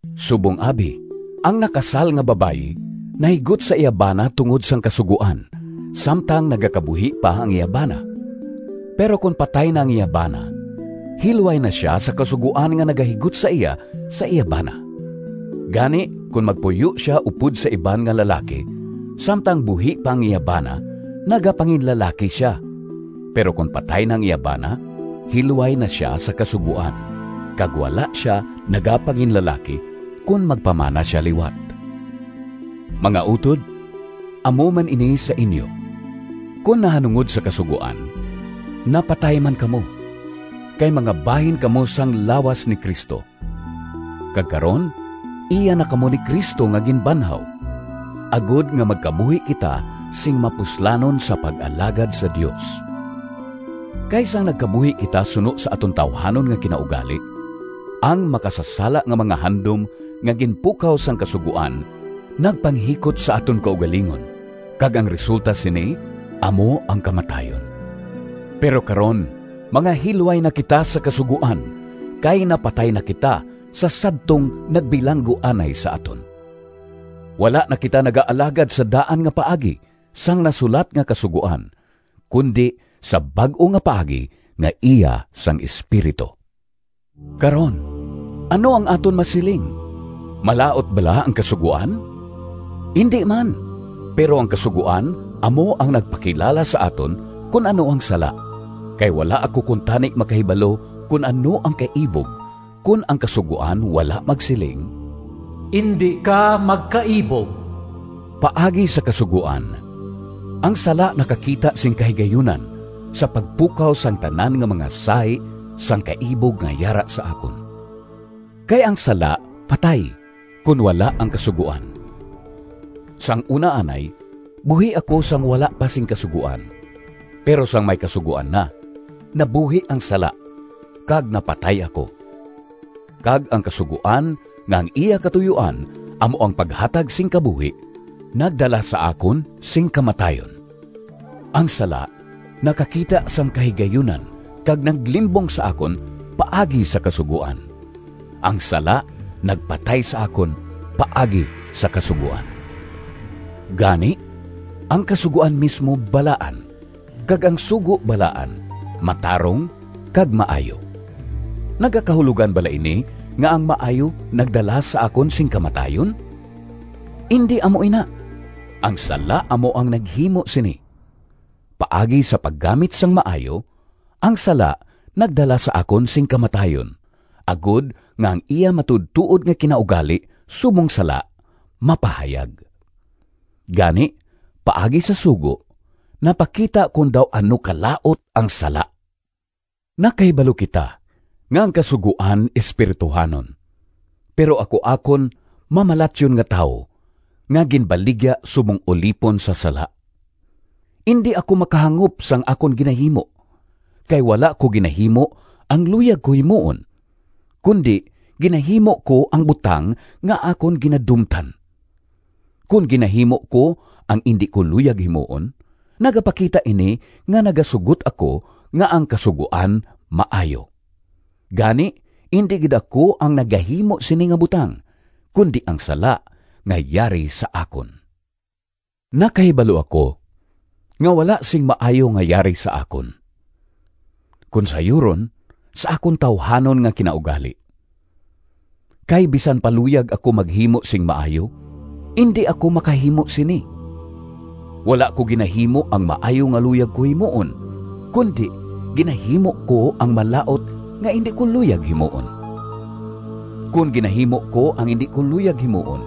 Subong abi, ang nakasal nga babayi nahigot sa iya bana tungod sang kasugoan, samtang nagakabuhi pa ang iya bana. Pero kon patay na ang iya bana, hilway na sia sa kasugoan nga nagahigot sa iya, sa iya bana. Gani, kon magpuyo sia upod sa iban nga lalaki samtang buhi pa ang iya bana, nagapanginlalaki sia. Pero kon patay na ang iya bana, hilway na sia sa kasugoan, kag wala sia nagapanginlalaki kon magpamana sia liwat. Mga utod, amo man ini sa inyo. Kon nahanungod sa Kasugoan, napatay man kamo, kay mga bahin kamo sang lawas ni Cristo; kag karon, iya na kamo ni Cristo nga ginbanhaw, agod nga magkabuhi kita sing mapuslanon sa pag-alagad sa Dios. Kay sang nagkabuhi kita suno sa aton tawuhanon nga kinaugali, ang makasasala nga mga handom nga ginpukaw sang Kasugoan nagpanghikot sa aton kaugalingon, kag ang resulta sini amo ang kamatayon. Pero karon mga hilway na kita sa Kasugoan, kay napatay na kita sa sadtong nagbilanggo anay sa aton. Wala na kita nagaalagad sa daan nga paagi sang nasulat nga kasugoan, kundi sa bag-o nga paagi nga iya sang Espiritu. Karon, ano ang aton masiling? Malaut bala ang Kasugoan? Indi man! Pero ang Kasugoan amo ang nagpakilala sa aton kon ano ang sala. Kay wala ako kuntani makahibalo kon ano ang kaibog kon ang Kasugoan wala magsiling, “Indi ka magkaibog.” Paagi sa kasugoan, ang sala nakakita sing kahigayunan sa pagpukaw sang tanan nga mga sahi sang kaibog nga yara sa akon. Kay ang sala patay, kon wala ang kasugoan. Sang una anay, buhi ako sang wala pa sing kasugoan. Pero sang may kasugoan na, nabuhi ang sala, kag napatay ako. Kag ang kasugoan nga ang iya katuyoan amo ang paghatag sing kabuhi, nagdala sa akon sing kamatayon. Ang sala nakakita sang kahigayunan kag naglimbong sa akon paagi sa kasugoan. Ang sala nagpatay sa akon paagi sa kasugoan. Gani, ang Kasugoan mismo balaan kag ang sugo balaan, matarong kag maayo. Nagakahulogan bala ini nga ang maayo nagdala sa akon sing kamatayon? Indi amo ina! Ang sala amo ang naghimo sini. Paagi sa paggamit sang maayo, ang sala nagdala sa akon sing kamatayon, agod nga ang iya matuodtuod nga kinaugali subong sala mapahayag. Gani, paagi sa sugo, napakita kon daw ano kalaut ang sala. Nakahibalo kita nga ang Kasugoan espirituhanon, pero ako akon mamalatyon nga tawo, nga ginbaligya subong ulipon sa sala. Indi ako makahangop sang akon ginahimo, kay wala ko ginahimo ang luyag ko himuon, kundi ginahimo ko ang butang nga akon ginadumtan. Kon ginahimo ko ang indi ko luyag himuon, nagapakita ini nga nagasugot ako nga ang Kasugoan maayo. Gani, indi gid ako ang nagahimo sini nga butang, kundi ang sala nga yari sa akon. Nakahibalo ako nga wala sing maayo nga yari sa akon, kon sayuron, sa akon tawuhanon nga kinaugali. Kay bisan pa luyag ako maghimo sing maayo, indi ako makahimo sini. Wala ko ginahimo ang maayo nga luyag ko himuon, kundi ginahimo ko ang malaut nga indi ko luyag himuon. Kon ginahimo ko ang indi ko luyag himuon,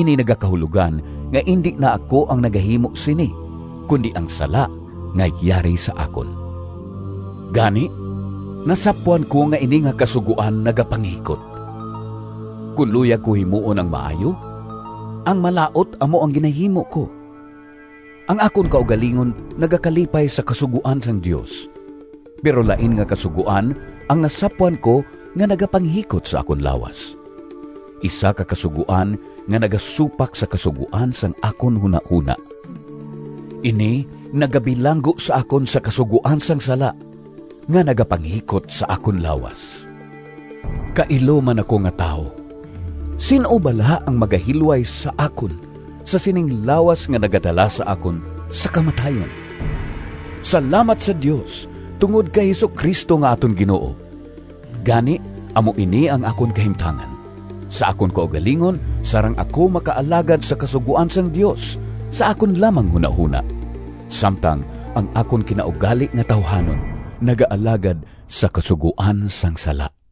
ini nagakahulogan nga indi na ako ang nagahimo sini, kundi ang sala nga yari sa akon. Gani, nasapwan ko nga ini nga kasugoan nagapanghikot: kon luyag ko himuon ang maayo, ang malaut amo ang ginahimo ko. Ang akon kaugalingon nagakalipay sa kasugoan sang Dios, pero lain nga kasugoan ang nasapwan ko nga nagapanghikot sa akon lawas—isa ka kasugoan nga nagasupak sa kasugoan sang akon hunahona. Ini nagabilanggo sa akon sa kasugoan sang sala nga nagapanghikot sa akon lawas. Kailo man ako nga tawo! Sin-o bala ang magahilway sa akon sa sining lawas nga nagadala sa akon sa kamatayon? Salamat sa Dios tungod kay Jesu-Cristo nga aton Ginoo! Gani, amo ini ang akon kahimtangan: sa akon kaugalingon sarang ako makaalagad sa kasugoan sang Dios sa akon lamang hunahona, samtang ang akon kinaugali nga tawuhanon nagaalagad sa kasugoan sang sala.